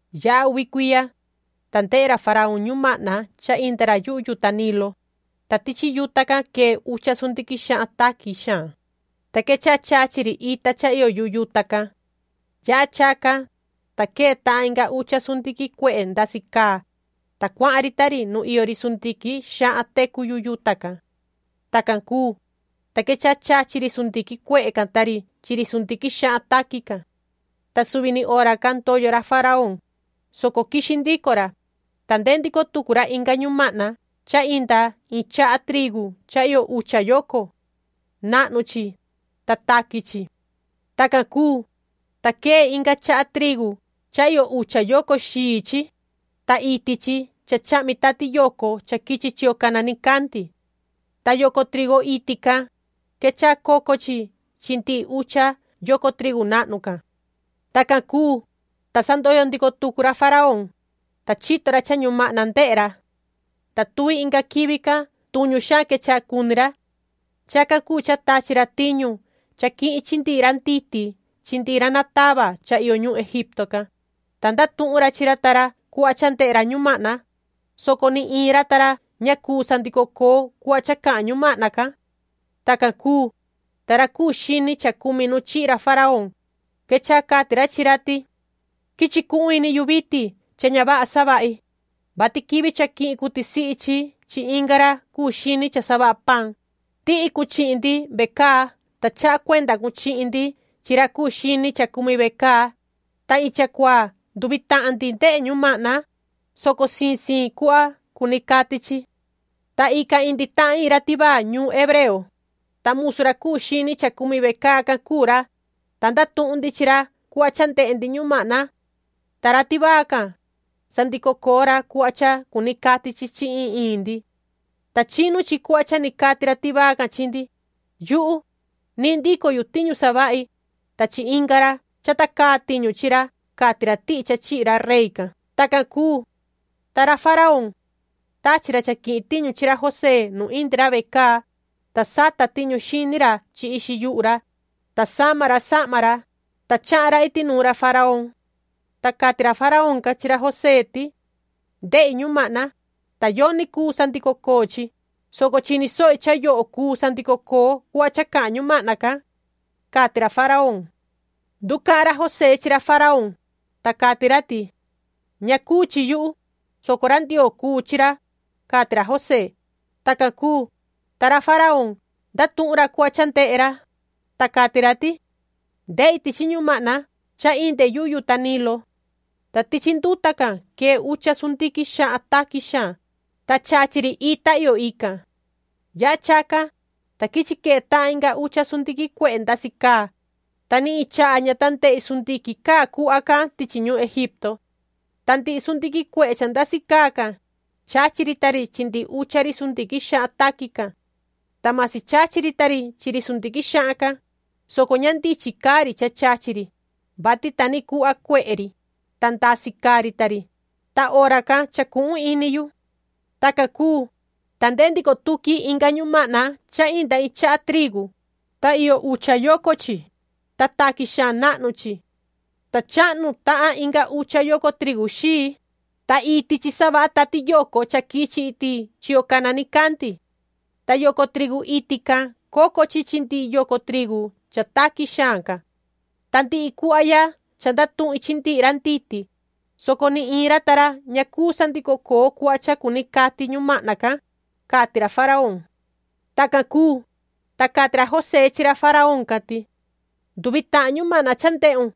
Yaha uvi cuiya, ta ndehe ra faraón ñumahna cha inda ra yuhu yuta Nilo, ta tichi yuta can quee ucha sundiquin xahan taqui xaan, ta quechaha chachi ri ita cha iyo yuhu yuta can. Yaha chacan, ta quee tahan inga ucha sundiquin cuehe ndasi caa, ta cuahan ri ta ri nu iyo ri sundiquin xahan tecu yuhu yuta can. Tacan cuu, ta quechaha chachi ri sundiquin cuehe can ta ri chi ri sundiquin xahan taqui can. Ta suvi ni hora can ndoyo ra faraón, soco quixi ndico ra, ta ndehe ndico tucu ra inga ñumahna cha inda iin chaha trigu cha iyo ucha yoco. Nahnu chi, ta taqui chi. Tacan cuu, ta quee inga chaha trigu cha iyo ucha yoco xii chi, ta iti chi cha chahmi tati yoco cha quichi chiyo cana nicandi. Ta yoco trigu iti can, quechaha coco chi chi ndihi ucha yoco trigu nahnu can. Tacan cuu, ta sa ndoyo ndico tucu ra faraón, ta chito ra cha ñumahna ndehe ra. Ta tuvi inga quivi can tuñu xaan quechaha cuni ra. Chacan cuu cha tachi ra tiñu cha quihin chi ndihi ra nditi chi ndihi ra natava cha iyo ñuhun Egipto can, ta ndatuhun ra chi ra ta ra cuhva cha ndehe ra ñumahna, soco ni iin ra ta ra ña cuu sandico coo cuhva cha cahan ñumahna can. Tacan cuu, ta ra cuu xini cha cumi nu chihi ra faraón, quechaha cati ra chi ra ti: ―Quichi cuhun ini yu vitin cha ña vaha savahi, vati quivi cha quihin cun tisihi chi chi inga ra cuu xini cha savaha paan, tihi cun chihin ndi vecaa, ta chaha cuenda cun chihin ndi chi ra cuu xini cha cumi vecaa. Ta iin chacuaa nduvi tahan ndi ndehe ñumahna, soco siin siin cuhva cuni cati chi. Ta ican indi tahan iin ra tivaa ñuun hebreo, ta musu ra cuu xini cha cumi vecaa can cuu ra, ta ndatuhun ndi chi ra cuhva cha ndehe ndi ñumahna. Ta ra tivaa can, sandico coo ra cuhva cha cuni cati chi chi iin iin ndi. Ta chinu chi cuhva cha ni cati ra tivaa can chihin ndi. Yuhu, nihin ndico yu tiñu savahi, ta chi inga ra, chata caa tiñu chi ra ―cati ra tihi cha chihi ra rey can. Tacan cuu, ta ra faraón, tachi ra cha quihin tiñu chi ra José nu indi ra vecaa, ta sata tiñu xini ra chi ixi yuhu ra, ta sama ra sahma ra, ta chahan ra iti nuun ra faraón. Ta cati ra faraón can chi ra José ti: ―Ndehi ñumahna, ta yoni cuu sandico coo chi, soco chini sohi cha yoho cuu sandico coo cuhva cha cahan ñumahna can ―cati ra faraón. Nducahan ra José chi ra faraón, ta cati ra ti: ―Ña cuu chi yuhu, soco ra Ndioo cuu chi ra ―cati ra José. Tacan cuu, ta ra faraón ndatuhun ra cuhva cha ndehe ra, ta cati ra ti: ―Ndehi tichi ñumahna cha inde yuhu yuta Nilo. Ta tichi nduta can quee ucha sundiquin xahan taqui xaan, ta chachi ri ita iyo ican. Yaha chacan, ta quichi quee tahan inga ucha sundiquin cuehe ndasi caa, ta ni iin chaha ña ta ndehi sundiquin caa cuhva can tichi ñuhun Egipto. Ta ndihi sundiquin cuehe cha ndasi caa can, chachi ri ta ri chi ndihi ucha ri sundiquin xahan taqui can. Ta masi chachi ri ta ri chi ri sundiquin xahan can, soco ña ndichin caa ri cha chachi ri, vati ta ni cuhva cuehe ri, ta ndasi caa ri ta ri, ta hora can chacuhun ini yu. Tacan cuu, ta ndehe ndico tuqui inga ñumahna cha inda iin chaha trigu, ta iyo ucha yoco chi, ta taqui xaan nahnu chi. Ta chahnu tahan inga ucha yoco trigu xii, ta iti chi savaha tati yoco cha quichi iti chiyo cana nicandi. Ta yoco trigu iti can, coco chi chi ndihi yoco trigu cha taqui xaan can. Ta ndihi cuhva ya cha ndatuhin chi ndihi ra nditi, soco ni iin ra ta ra ña cuu sandico coo cuhva cha cuni cati ñumahna can ―cati ra faraón. Tacan cuu, ta cati ra José chi ra faraón can ti: ―Nduvi tahan ñumahna cha ndehun,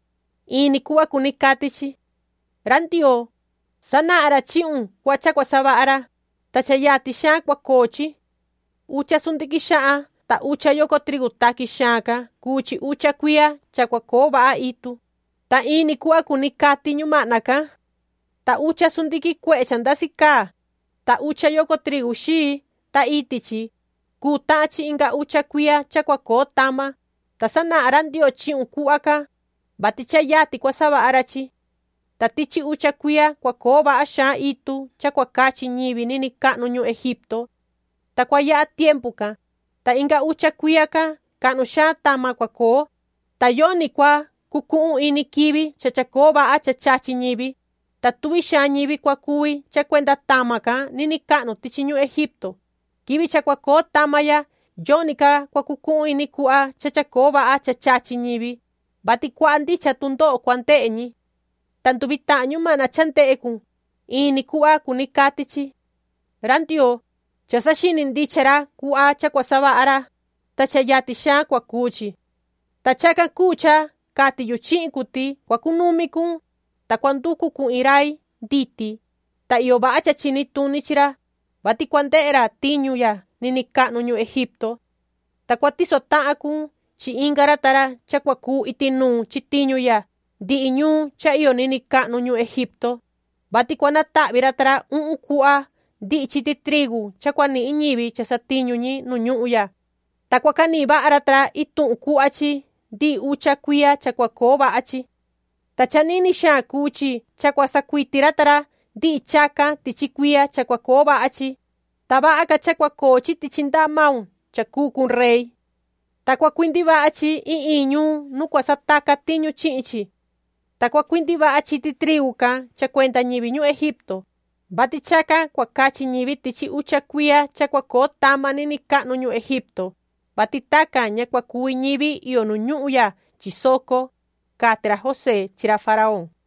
in ni cuhva cuni cati chi. Ra Ndioo, sanahan ra chihun cuhva cha cua savaha ra, ta cha yatin xaan cua coo chi. Ucha sundiquin xahan ta ucha yoco trigu taqui xaan can cuu chi ucha cuiya cha cua coo vaha itu, ta in ni cuhva cuni cati ñumahna can. Ta ucha sundiquin cuehe cha ndasi caa, ta ucha yoco trigu xii, ta iti chi, cuu tahan chi inga ucha cuiya cha cua coo tama. Ta sanahan ra Ndioo chihun cuhva can, vati cha yatin cua savaha ra chi. Ta tichi ucha cuiya cua coo vaha xaan itu cha cua cachi ñivi niniin cahnu ñuhun Egipto. Ta cua yaha tiempu can, ta inga ucha cuiya can cahnu xaan tama cua coo, ta yoni cua cucuhun ini quivi cha chacoo vaha cha chachi ñivi, ta tuvi xaan ñivi cua cuvi cha cuenda tama can niniin cahnu tichi ñuhun Egipto. Quivi cha cua coo tama ya yoni ca cua cucuhun ini cuhva cha chacoo vaha cha chachi ñivi, vati cuaha ndicha tundoho cua ndehe ñi. Ta nduvi tahan ñumahna cha ndehe cun, in ni cuhva cuni cati chi. Ra Ndioo, cha saxini ndicha ra cuhva cha cua savaha ra, ta cha yatin xaan cua cuu chi. “Ta chacan cuu cha cati yu chihin cun ti cua cunumi cun, ta cua nducu cun iin rai nditi, ta iyo vaha cha chini tuni chi ra, vati cua ndehe ra tiñu ya niniin cahnu ñuhun Egipto. Ta cua tiso tahan cun chi inga ra ta ra cha cua cuu iti nuun chi tiñu ya ndihi ñuun cha iyo niniin cahnu ñuhun Egipto, vati cua natahvi ra ta ra uhun cuhva ndihi chiti trigu cha cua nihin ñivi cha satiñu ñi nu ñuhun ya, ta cua canihin vaha ra ta ra ituhun cuhva chi ndihi ucha cuiya cha cua coo vaha chi. Ta cha nini xaan cuu chi cha cua sacuiti ra ta ra ndihi chacan tichi cuiya cha cua coo vaha chi, ta vaha ca cha cua coo chi tichi ndaha maun cha cuu cun rey. Ta cua cuindi vaha chi iin iin ñuun nu cua sataca tiñu chihin chi. Ta cua cuindi vaha chiti trigu can cha cuenda ñivi ñuhun Egipto, vati chacan cua cachi ñi tichi ucha cuiya cha cua coo tama niniin cahnu ñuhun Egipto, vati tacan ña cua cuvi ñivi iyo nu ñuhun ya chi soco ―cati ra José chi ra faraón.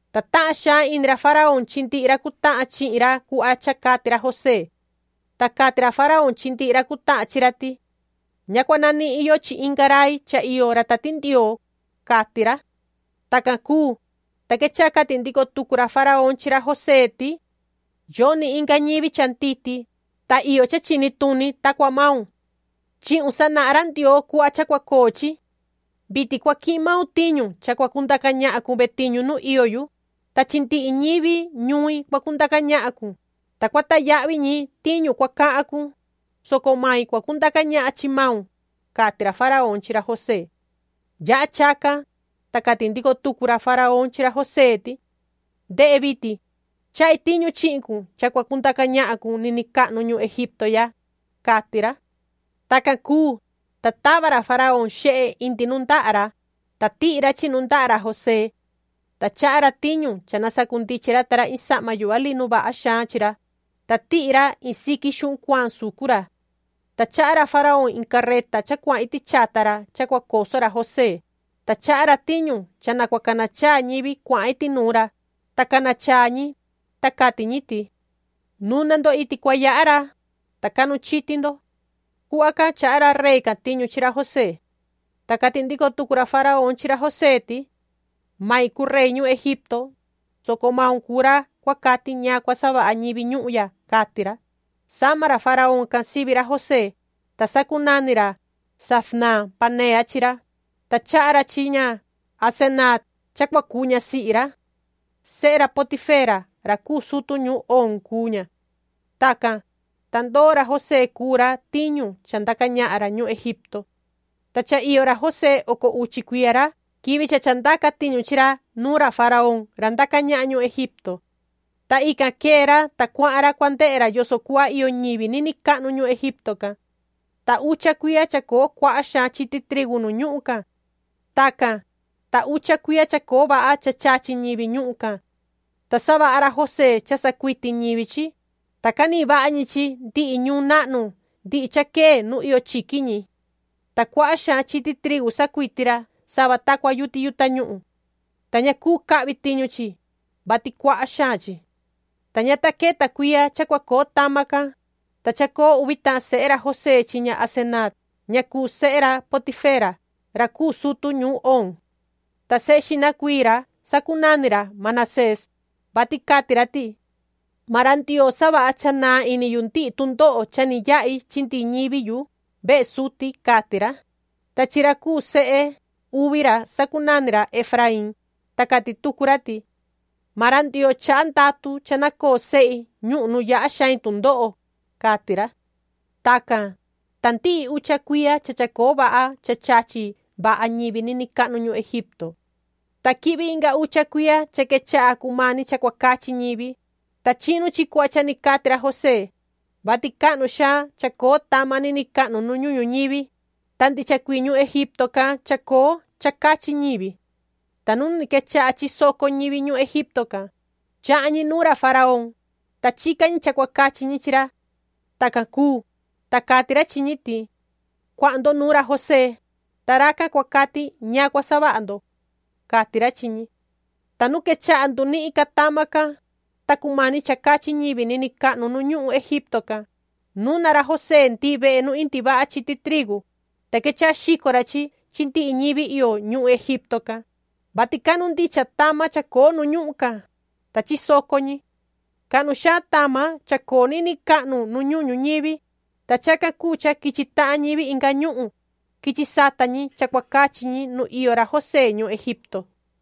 Ta tahan xaan ini ra faraón chi ndihi ra cutahan chihin ra cuhva cha cati ra José. Ta cati ra faraón chi ndihi ra cutahan chi ra ti: ―Ña cua nanihin yo chi inga rai cha iyo ra Tati Ndioo ―cati ra. Tacan cuu, ta quechaha cati ndico tucu ra faraón chi ra José ti: ―Yoni inga ñivi cha nditi, ta iyo cha chini tuni ta cua maun. Chihun sanahan ra Ndioo cuhva cha cua coo chi. Vitin cua quihin maun tiñu cha cua cundaca ñahan cun vetiñu nu iyo yu, ta chi ndihi ñivi ñuin cua cundaca ñahan cun, ta cua tayahvi ñi tiñu cua cahan cun, soco mai cua cundaca ñahan chi maun ―cati ra faraón chi ra José. Yaha chacan, ta cati ndico tucu ra faraón chi ra José ti: ―Ndehe vitin, chahi tiñu chihin cun cha cua cundaca ñahan cun niniin cahnu ñuhun Egipto ya ―cati ra. Tacan cuu, ta tava ra faraón xehe indi nundaha ra, ta tihi ra chi nundaha ra José. Ta chaha ra tiñu cha na sacundichin ra ta ra iin sahma yuhva linu vaha xaan chi ra, ta tihi ra iin siqui xuhun cuaan sucu ra. Ta chaha ra faraón iin carreta cha cuahan iti chata ra cha cua coso ra José, ta chaha ra tiñu cha na cua cana chaa ñivi cuahan iti nuun ra, ta cana chaa ñi, ta cati ñi: “¡Nuna ndo iti cua yaha ra, ta cahnu chiti ndo!” Cuhva can chaha ra rey can tiñu chi ra José. Ta cati ndico tucu ra faraón chi ra José ti: ―Main cuu rey ñuhun Egipto, soco maun cuu ra cua cati ñaan cua savaha ñivi ñuhun ya ―cati ra. Sama ra faraón can sivi ra José, ta sacunani ra Zafnaat-panea chi ra, ta chaha ra chi ña Asenaat cha cua cuu ñasihi ra. Sehe ra Potifera ra cuu sutu ñuun Oon cuu ña. Tacan, ta ndoo ra José cuu ra tiñu cha ndaca ñahan ra ñuhun Egipto. Ta cha iyo ra José oco uchi cuiya ra quivi cha chandaca tiñu chi ra nuun ra faraón ra ndaca ñahan ñuhun Egipto. Ta ican quee ra, ta cuahan ra cua ndehe ra yoso cuhva iyo ñivi niniin cahnu ñuhun Egipto can. Ta ucha cuiya chacoo cuaha xaan chiti trigu nu ñuhun can. Tacan, ta ucha cuiya chacoo vaha cha chachi ñivi ñuhun can. Ta savaha ra José cha sacuiti ñivi chi, ta canihin vaha ñi chi ndihi ñuun nahnu ndihi cha quee nu iyo chiqui ñi. Ta cuaha xaan chiti trigu sacuiti ra sava ta cua yuti yuhu tañuhun. Ta ña cuu ca cahvi tiñu chi, vati cuaha xaan chi. Ta ña ta queta cuiya cha cua coo tama can, ta chacoo uvi tahan sehe ra José chi ña Asenaat ña cuu sehe ra Potifera ra cuu sutu ñuun Oon. Ta sehe xihna cuii ra sacunani ra Manasés, vati cati ra ti: “Maan ra Ndioo savaha cha naan ini yu ndihi tundoho cha ni yahi chi ndihi ñivi yu vehe suti”, cati ra. Ta chi ra cuu sehe uvi ra sacunani ra Efraín, ta cati tucu ra ti: “Maan ra Ndioo chaha ndatu cha na coo sehi ñuhun nu yaha xain tundoho”, cati ra. Tacan, ta ndihi ucha cuiya cha chacoo vaha cha chachi vaha ñivi niniin cahnu ñuhun Egipto. Ta quihvi inga ucha cuiya cha quechaha cumani cha cua cachi ñivi, ta chinu chi cuhva cha ni cati ra José, vati cahnu xaan chacoo tama niniin cahnu nu ñuhun ñuñivi, ta ndicha cuii ñuhun Egipto can chacoo cha cachi ñivi. Ta nu ni quechaha chisoco ñivi ñuhun Egipto can, chahan ñi nuun ra faraón, ta chica ñi cha cua cachi ñi chi ra. Tacan cuu, ta cati ra chi ñi ti: “Cuahan ndo nuun ra José, ta racan cua cati ñaan cua savaha ndo”, cati ra chi ñi. Ta nu quechaha ndunihin ca tama can, ta cumani cha cachi ñivi niniin cahnu nu ñuhun Egipto can, nuna ra José ndihi vehe nu indi vaha chiti trigu, ta quechaha xico ra chi ndihi ñivi iyo ñuhun Egipto can, vati cahnu ndicha tama chacoo nu ñuhun can, ta chisoco ñi. Cahnu xaan tama chacoo niniin cahnu nu ñuhun ñuñivi, ta chacan cuu cha quichi tahan ñivi inga ñuhun, quichi sata ñi cha cua cachi ñi nu iyo ra José ñuhun Egipto.